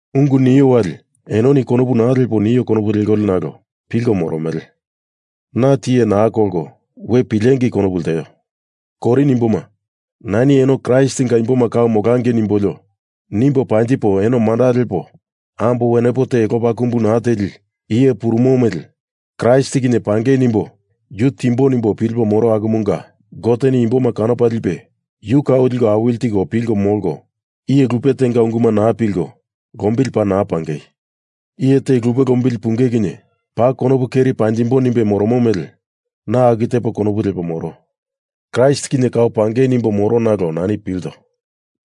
Ungu nio wali enoni konopu naa lepo nio konopu lekolio nalo pilko moromele. Na tiye naa kolko we pilengei konopu lteo. Korin imboma, nani eno Kraistinga imboma kau molangei nimbolio nimbo panjipo eno manda lepo ambo wenepo te lopa kumbu naa teli iye purumomu mele Kraist kinye pangei nimbo yu timbo nimbo pilipo moro akumunga Goteni imboma kanopa lipe yu kau liko awili tiko pilko molko, iye lupe tenga unguma naa pilko lombili paa naa pangei. Iye te lupe lombili pungei kinye paa konopu keri panjimbo nimbe moromo mele na aku tepo konopu lepo moro. Kraist kinye kau pangei nimbo moro nalo nani pilto.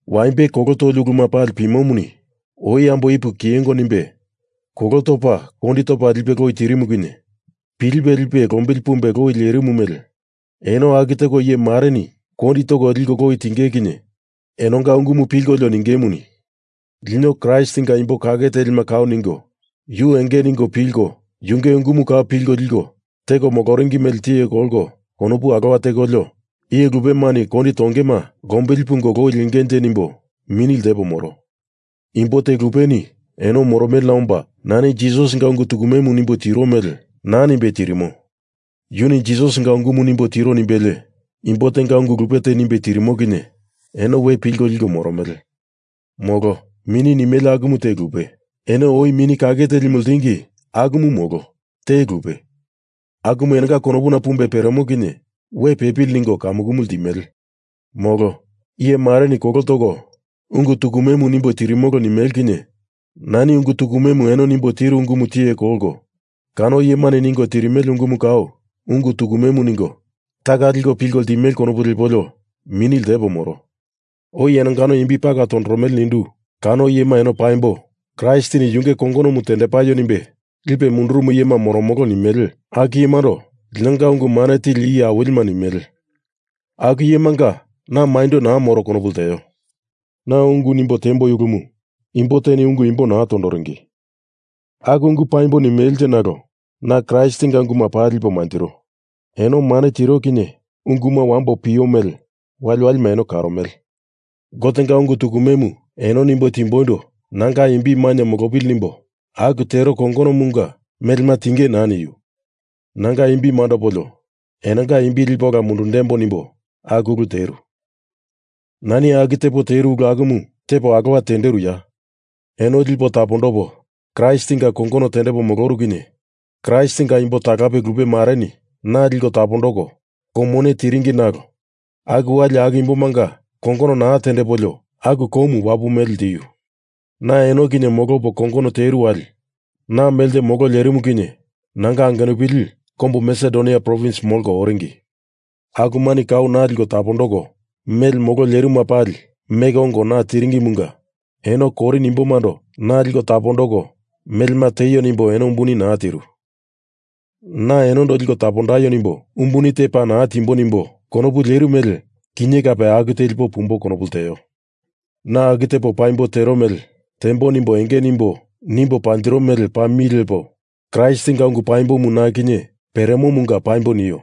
Waimbe kolo toli uluma pali pimomuni oi ambo Ipu kiyengo nimbe kolo topa kondi topa lipe loi tirimu kinye pilipe lipe lombili pumbe loi lerimu mele eno aku teko iye mareni kondi toko liko loi tinge kinye enonga ungumu pilkolio ningemuni, Lino Kraistinga imbo kake telima kau ningo yu enge ningo pilko yunge ungumu kau pilko liko teko moloringi mele tiye kolko konopu alowa tekolio, iye lupemani kondi tongema lombili pungo loi lengenje nimbo mini ltepo moro. Imbo te lupeni eno moromelena omba, nani Jisasinga ungu tukumemu nimbo tiro mele naa nimbe tirimo, yuni Jisasinga ungumu nimbo tiro nimbelie imbo tenga ungu lupe te nimbe tirimo kinye eno we pilko liko moromele. Molo, mini nimele akumu te lupe, eno oi Mini Kake Telimu ltingi akumu molo, te lupe, akumu enonga konopuna pumbe peremo kinye we pepili ningo kamukumu ltimele. Molo, iye mareni kolo toko ungu tukumemu nimbo tirimolo nimele kinye nani ungu tukumemu eno nimbo tiru ungumu tiye kolko kano iyemani ningo tirimele ungumu kau ungu tukumemu ningo, taka liko pilko ltimele konopu lepolio mini ltepo moro. Oi enongano imbi pala tondoromele nindu, kano iyema eno paimbo Kraistini Yunge kongonomu tendepaio nimbe lipe mundurumu iyema moromolo nimele aku iyemando linonga ungu mane tili iye awilima nimele, aku iyemanga na maindo naa moro konopu lteo. Na ungu nimbo tiemboi ulumu imbo teni ungu imbo naa tondoringi aku ungu paimbo nimelenje nalo na Kraistinga unguma paa lipo manjiro. Eno mane tiro kinye unguma wambo pio mele waliwalima eno karomele. Gotenga ungu tukumemu eno nimbo timboindo nanga imbi mainye molopili nimbo aku tero kongonomunga melema tiengei naa niu. Nanga imbi mandopolio enonga imbi lipo ola mundundembo nimbo aku ulu teru. Nani aku tepo teru ulu akumu tepo alowa tenderuya? Eno lipo tapondopo Kraistinga kongono tendepo moloru kinye Kraistinga imbo talape lupe mareni na liko tapondoko kou mone tiringi nalo aku wali aku imbomanga kongono naa tendepolio aku koumu wapu mele ltiu. Na eno kinye molopo kongono teru wali na melte molo lerimu kinye nanga angenupili kombu Masedonia provins molko oringi. Akumani kau na liko tapondoko mele molo lerimuma pali meko ongo na tiringimunga eno Korin imbomando na liko tapondoko melema tieio nimbo eno umbuni te naa tiru. Na enondo liko tapondaio nimbo umbuni te paa naa timbo nimbo konopu leru mele kinye kape aku telipo pumbo konopu lteo. Na aku tepo paimbo tero mele tembo nimbo enge nimbo nimbo panjiro mele paa mi lepo Kraistinga ungu paimbomu na kinye peremomunga paimbo nio.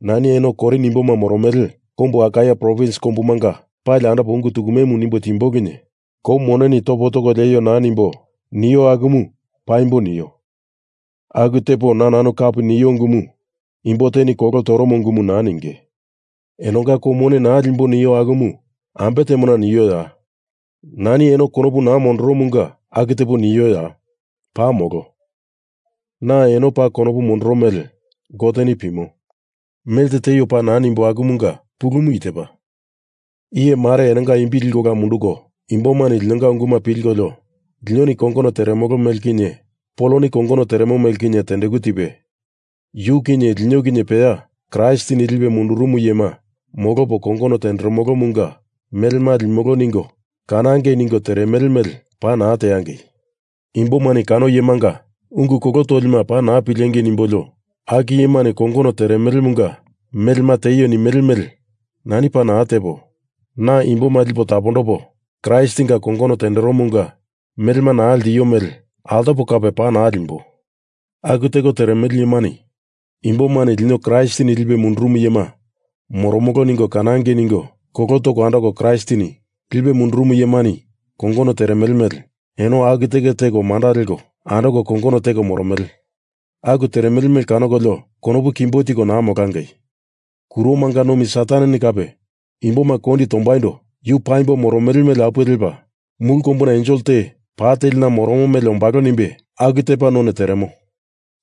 Nani eno Korin imboma moromele kombu Akaia provins kombumanga pali andopo ungu tukumemu nimbo timbo kinye kou moneni topo toko lieio naa nimbo nio akumu paimbo nio. Aku tepo na nanu kapi nio ungumu imbo teni kolo toromo ungumu naa ninge. Enonga kou mone naa limbo nio akumu ambe temona nioya? Nani eno konopu naa mondoromunga aku tepo nioya? Paa molo! Na eno paa konopu mondoro mele Goteni pimo. Melte tieio paa naa nimbo akumunga pulumu i tepa. Iye mare enonga imbi liko ola munduko imbomani linonga unguma pilkolio linoni kongono teremolo mele kinye Poloni kongono teremo mele kinye tendeku tipe, yu kinye lino kinye peya Kraistini lipe mundurumu iyema molopo, kongono teremolomunga melema limolo ningo kanangei ningo teremele mele paa naa teangei. Imbomani kano iyemanga ungu kolo tolima paa naa pilengei nimbolio aku iyemani kongono teremolomunga melema tieio nimele mele nani paa naa tepo, na imboma lipo tapondopo Kraistinga kongono tenderomunga melema naa ltio mele altopo kape paa naa limbo. Aku teko teremele iyemani imbomani lino Kraistini lipe mundurumu iyema moromolo ningo kanangei ningo kolo toko andoko Kraistini lipe mundurumu iyemani kongono teremele mele eno aku teko manda leko andoko kongono teko moromele. Aku teremele mele kanokolio konopu kimbo tiko naa molangei. Kuromanga nomi Sataneni kape imboma kondi tombaindo yu paimbo moromo mele apuwe lepa mulu kombuna ensel te pa telina moromo mele molambo nimbe aku tepa none teremo.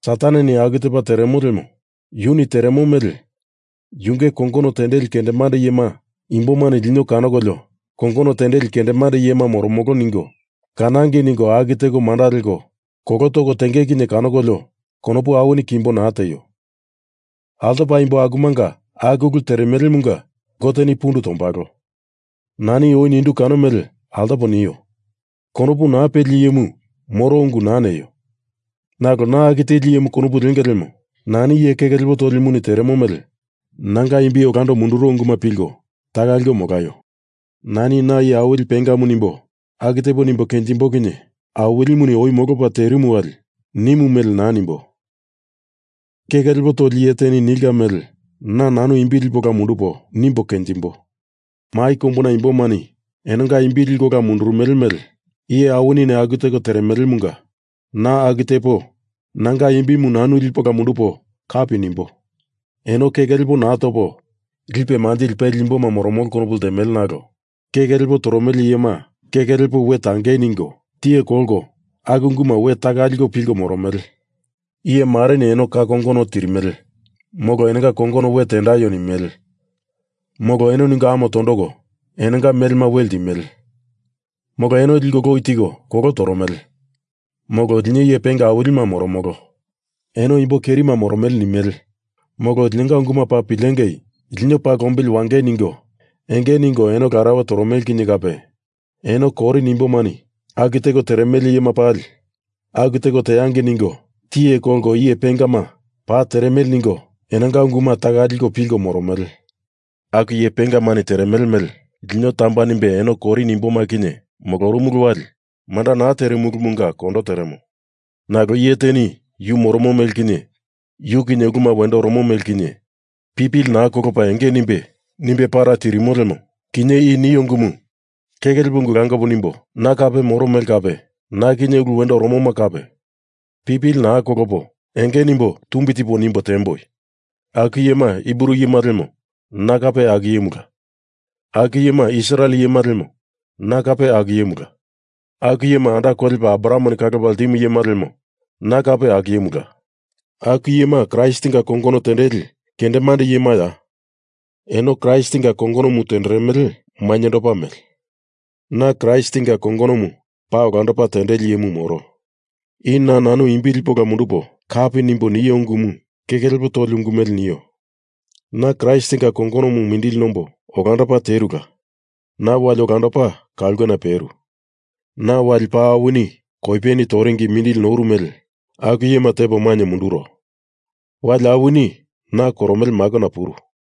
Sataneni aku tepa teremo lemo yuni teremo mele yunge kongono tendeli kendemande iyema imbomani lino kanokolio iye tumbi nilimunga kongono tendeli kendemande iyema moromolo ningo kanangei ningo aku teko manda leko kolo toko tenge kinye kanokolio konopu awini kimbo naa tieio. Altopa imbo akumanga aku ulu teremelemunga Goteni pundu tombalo. Nani oi nindu kano mele altopo nio. Konopu naa peli iyemu moro ungu naa neio. Nalo na aku teli iyemu konopu lenge lemo nani iye keke lepo tolimuni teremo mele nanga imbi olando munduro unguma pilko taka liko molaio. Nani na iye awili pengamu nimbo aku tepo nimbo kenjimbo kinye Awilimuni oi molopa terimu wali nimu mele naa nimbo. Keke lepo toli iye teni nilka mele na nanu imbi lipo ola mundupo nimbo kenjimbo. Mai kombuna imbomani enonga imbima liko ola mundurumele mele iye awinini aku teko teremelemunga na aku tepo nanga imbimu nanu lipo ola mundupo kapi nimbo. Eno keke lepo naa topo lipe manjili peli imboma moromolo konopu ltemele nalo keke lepo toromele iyema keke lepo we tangei ningo tiye kolko aku unguma we taka liko pilko moromele. Iye mareni eno ka kongono tirimele, molo enonga kongono we tendaio nimele, molo eno ningo ame tondoko enonga melema we ltimele, molo eno liko loi tiko kolo toromele, molo lino iye penga awilima moromolo. Eno imbo kerima moromele nimele, molo linonga unguma paa pilengei, lino paa lombili wangei ningo enge ningo eno larauwe toromele kinye kape, eno Korin imbomani aku teko teremele iyema pali aku teko teangei ningo tiye kolko iye pengama, paa teremele ningo enonga unguma taka liko pilko moromele. Aku iye pengamani teremele mele lino tamba nimbe eno Korin imboma kinye molorumulu wali manda naa terimulumunga kondo teremo. Nalo iye teni yu moromo mele kinye, yu kinye uluma wendo oromo mele kinye, pipili naa kolopa enge nimbe nimbe para tirimo lemo kinye i nio ungumu keke lepo ungu langopo nimbo na kape moro mele kape na kinye ulu wendo oromoma kape pipili naa kolopo enge nimbo tumbi tipo nimbo tiemboi. Aku iyema Hibru iyema lemo na kape aku iyemula. Aku iyema Israel iyema lemo na kape aku iyemula. Aku iyema anda kolepa Abrahameni kalopa ltimu iyema lemo na kape aku iyemula. Aku iyema Kraistinga kongono tendeli kendemande iyemaya? Eno Kraistinga kongonomu tenderemele mainyendopa mele, na Kraistinga kongonomu paa olandopa tendeli iyemu moro. I na nanu imbi lipo ola mundupo kapi nimbo nio ungumu keke lepo toli ungu mele nio. Na Kraistinga kongonomu mindili nombo olandopa terula. Na wali olandopa ka ulkena peru. Na wali paa awini koipeni toringi mindili noru mele aku iyema tepo mainye munduro. Wali awini na koromele makona puru.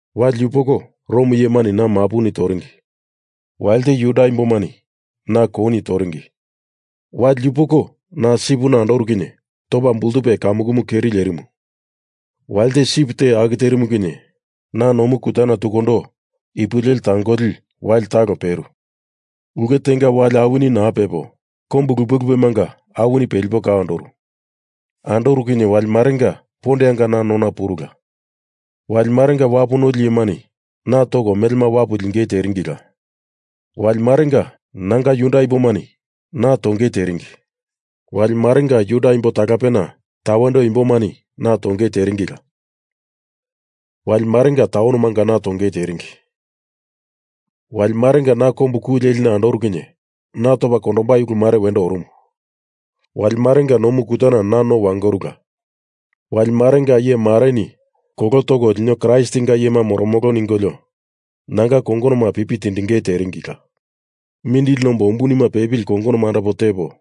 Wali yupoko Rom iyemani na mapuni toringi; walite Juda imbomani na kouni toringi, wali yupoko na sipina andoru kinye topa bultupe kamukumu keri lierimu; walite sip te aku terimu kinye na nomu kutana tukundo ipo leli tangoli wali talo peru; ulke tenga wali awini naa pepo, kombu lupe lupemanga awini pelipo kau andoru; andoru kinye wali marenga pondeanga na nona purula; wali marenga wapu noli iyemani na toko melema wapu lingei teringila; wali marenga nanga Juda imbomani na tongei teringi; wali marenga Juda imbo talapena tawendo imbomani na tongei teringila; wali marenga taunomanga na tongei teringi; wali marenga na kombu ku lelina andoru kinye na topa kondombai ulumare wendo orumu; wali marenga nomu kutana na no wangorula; wali marenga iye mareni kolo toko lino Kraistinga iyema moromolo ningolio nanga kongonoma pipi tindingei teringila. Mindili nombo umbunima pepili kongonoma andopo tepo,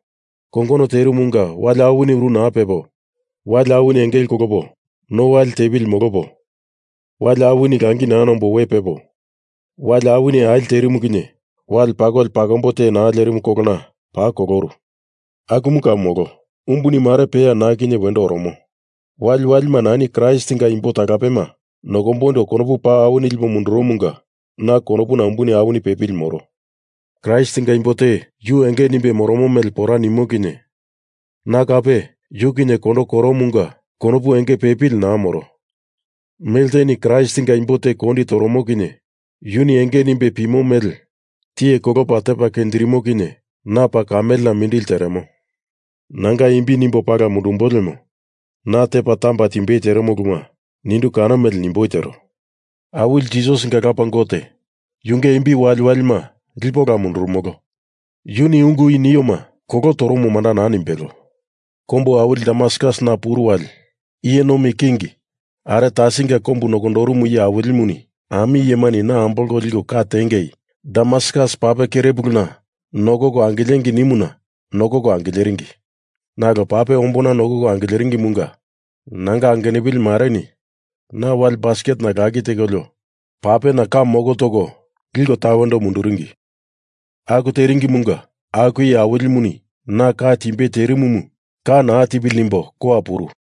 kongono terumunga wali awini uru naa pepo, wali awini engele kolopa no wali tepili molopo, wali awini langi naa nombo we pepo, wali awini ali terimu kinye wale pakoli pakombo te naa lerimu kolona paa koloru. Akumu kau molo. Umbuni mare peya na kinye wendo oromo. Waliwalima nani Kraistinga imbo talapema nokomboindo konopu paa awini lipo munduromunga na konopuna umbuni awini pepili moro. Kraistinga imbo te yu enge nimbe moromo mele pora nimo kinye na kape yu kinye kondo koromunga konopu enge pepili naa moro. Melteni Kraistinga imbo te kondi toromo kinye yuni enge nimbe pimo mele tiye kolopa tepa kenjirimo kinye na paa kamelena mindili teremo. Nanga imbi nimbo pala mundumbo lemo na tepa tamba timbei teremo uluma nindu kano mele nimboi tero. Awili Jisasinga Lapa Gote, yunge imbi waliwalima lipo ola mundurumolo, yuni ungu i nioma kolo toromo manda naa nimbelo. Kombu awili Damaskus na puru wali iye nomi king Aretasinga kombu nokondorumu iye awilimuni ami iyemani na ambolko liko ka tiengei, Damaskus pape kerepuluna nokoko angilengei nimuna nokoko angileringi. Nalo pape ombona nokoko angileringimunga nanga angenupili mareni na wale basketena lakilkolio papena ka moko toko liko tawendo munduringi. Aku teringimunga aku iye awilimuni na ka timbei terimumu ka naa tipili nimbo kowa puru.